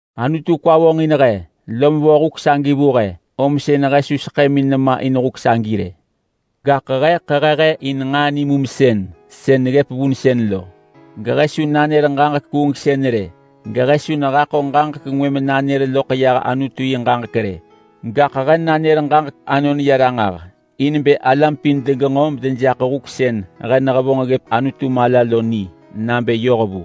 Anutu kwa vonġin he lom vo huk sënë vu he, om sën he su seḳëmin nema in huk sagi rë. Gaḳ he ḳehe he in nġaa nimumsën sën neggëp vunsën lo, gehe su nanër ġaġek kuungsën rë, gehe su nehaḳo ġaġek ngwë menanër loḳ yah Anutu yi ġaġek rë. Gaḳ he nanër ġaġek anon ya ranġah in bë alam pin degenġo medejaḳ huk sën he nehevonġ ggëp Anutu mala lo ni nabë yoh vu.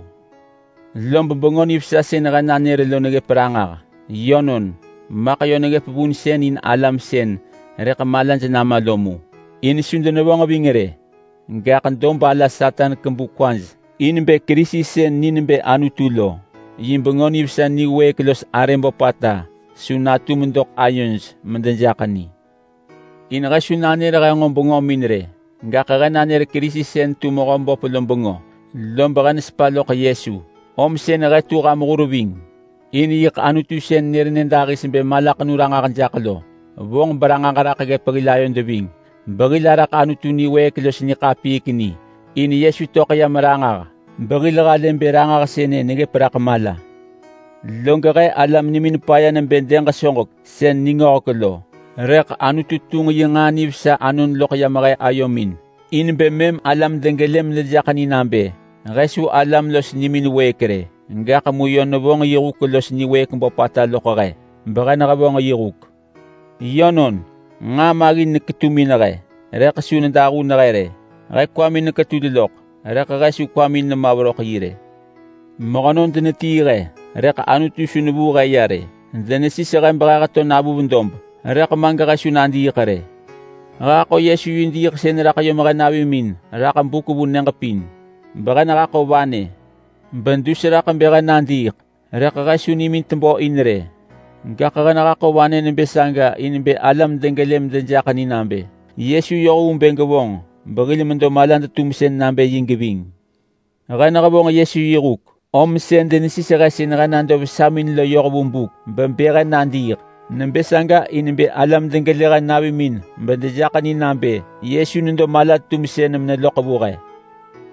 Lob Bengö Nivesa sën he nanër lo neggëp ranġah. Yönon, maḳ yö neggëp vunsën in alam sën rëḳ malaj nama lo mu, in su denevonġ ving rë. Gaḳ dob ala Satan kebu kwaj in bë Kerisi sën ni nebë Anutu lo, yi Bengö Nivesa niwëëk los arë böpata su natum doḳ ayoj medejaḳ ni. In he su nanër he nġo bengömin rë, gaḳ he nanër Kerisi sën tu Mehöböp lo bengö, lob he nesepa loḳ Yesu om sën he tu ham hur ving. In yiḳ Anutu sën nër nyëdahis bë malaḳenu ranġah jaḳ lo vonġ beranġah raḳ ggëp hil ayod ving behil araḳ Anutu niwëëk los niḳapiik ni. In Yesu töḳ yam ranġah, behil halë bë ranġah sënë neggëp raḳ mala. Log he alam nimin paya nebë dëg soġek sën ningöhek lo, rëḳ Anutu tunġ yi nġaa nivesa anon loḳ yam he ayomin in bë mëm alam degelë medejaḳ ni nabë he su alam los nimin wëëk rë. Gaḳ mu yö nevonġ yi huk los niwëëk böpata loḳ he behe nehevonġ yi huk. Yönon nġaa maggin neketumin he, rëḳ su nedahun he rë. He kwamin neketul loḳ, rëḳ he su kwamin nema veröḳ yi rë. Mehönon denetii he, rëḳ Anutu su nevuu he ya rë. Denesis he behe heto navuv dob, rëḳ ma gehe su nadiiḳ rë. He haḳo Yesu yi diiḳsën raḳ yom he navimin raḳ buk vu nyëġ pin behe nehaḳo vanë bedus raḳ bë he nadiiḳ. Rëḳ he su nimin tebö in rë, gaḳ he nehaḳo vanë nebë saga in bë alam degelë medejaḳ ni nabë Yesu yoh vu bë gevonġ behil medo malad-tumsën nabë yi geving. He nehevonġ Yesu yi huk om sën denesis he sën nado vesamin lo yoh vu buk bebë he nadiiḳ. Nebë saga in bë alam degelë he navimin medejaḳ ni nabë Yesu nedo mala-tumsën meneloḳ vu he.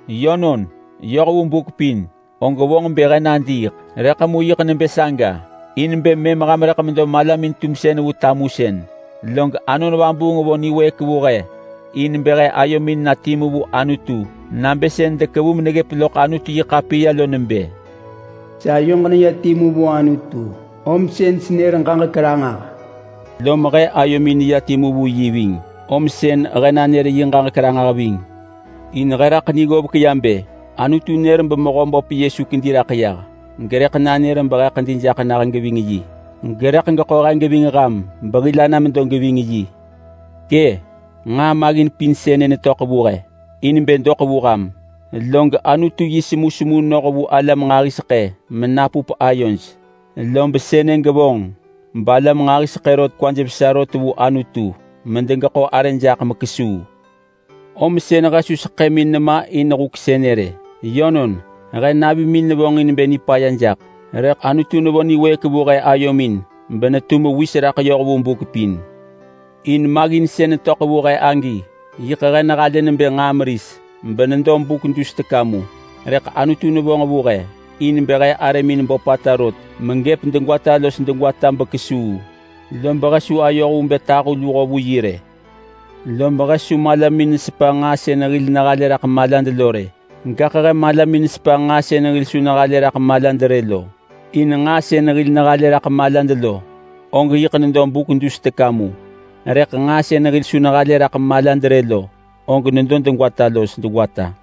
Yönon, yoh vu buk pin og vonġ bë he nadiiḳ, rëḳ mu yiḳ nebë saga in bë mëm ham rëḳ medo malamin-tumsën vu tamusën. Log Anon Vabuung vo niwëëk vu he in bë he ayomin na timu vu Anutu nabë sën dekevu meneggëp loḳ Anutu-yi-ḳapiya lo nebë, “Sayoġ neya timu vu Anutu om sën senër ġaġek ranġah.” Lom he ayomin neya timu vu yi ving, om sën he nanër yi ġaġek ranġah ving. In he raḳ ni ggovek ya bë Anutu nër beMehöböp Yesu kedi raḳ yah, gerëḳ nanër behe ḳedi jaḳ nah geving yi, gerëḳ geḳo he geving ham behil ana medo geving yi. Kë! Nġaa maggin pin sënë netöḳ vu he in bë doḳ vu ham, log Anutu yi semusemu noh vu alam nġahiseḳë menapup ayoj. Lob sënë gevonġ balam nġahiseḳë rot kwaj vesa rot vu Anutu medegeḳo arë jaḳ mekesuu. Om sën he su seḳëmin nema in huk sënë rë. Yönon, he navimin nevonġin bë nipaya jaḳ, rëḳ Anutu nevo niwëëk vu he ayomin benetu mewis raḳ yoh vu buk pin. In maggin sën netöḳ vu he agi, yiḳ he nehalë nebë nġaa meris benedo buk dus teka mu. Rëḳ Anutu nevonġ vu he in bë he arëmin böpata rot megëp degwata los degwata bekesuu, lob he su ayoh vu bë tahu luho vu yi rë. Lob he su malamin nesepa nġaa sën hil nehalë raḳ malad lo rë, gaḳ he malamin nesepa nġaa sën hil su nehalë raḳ malad rë lo. In nġaa sën hil nehalë raḳ malad lo og yiḳ nedo buk dus teka mu, rëḳ nġaa sën hil su nehalë raḳ malad rë lo, og nedo degwata los degwata.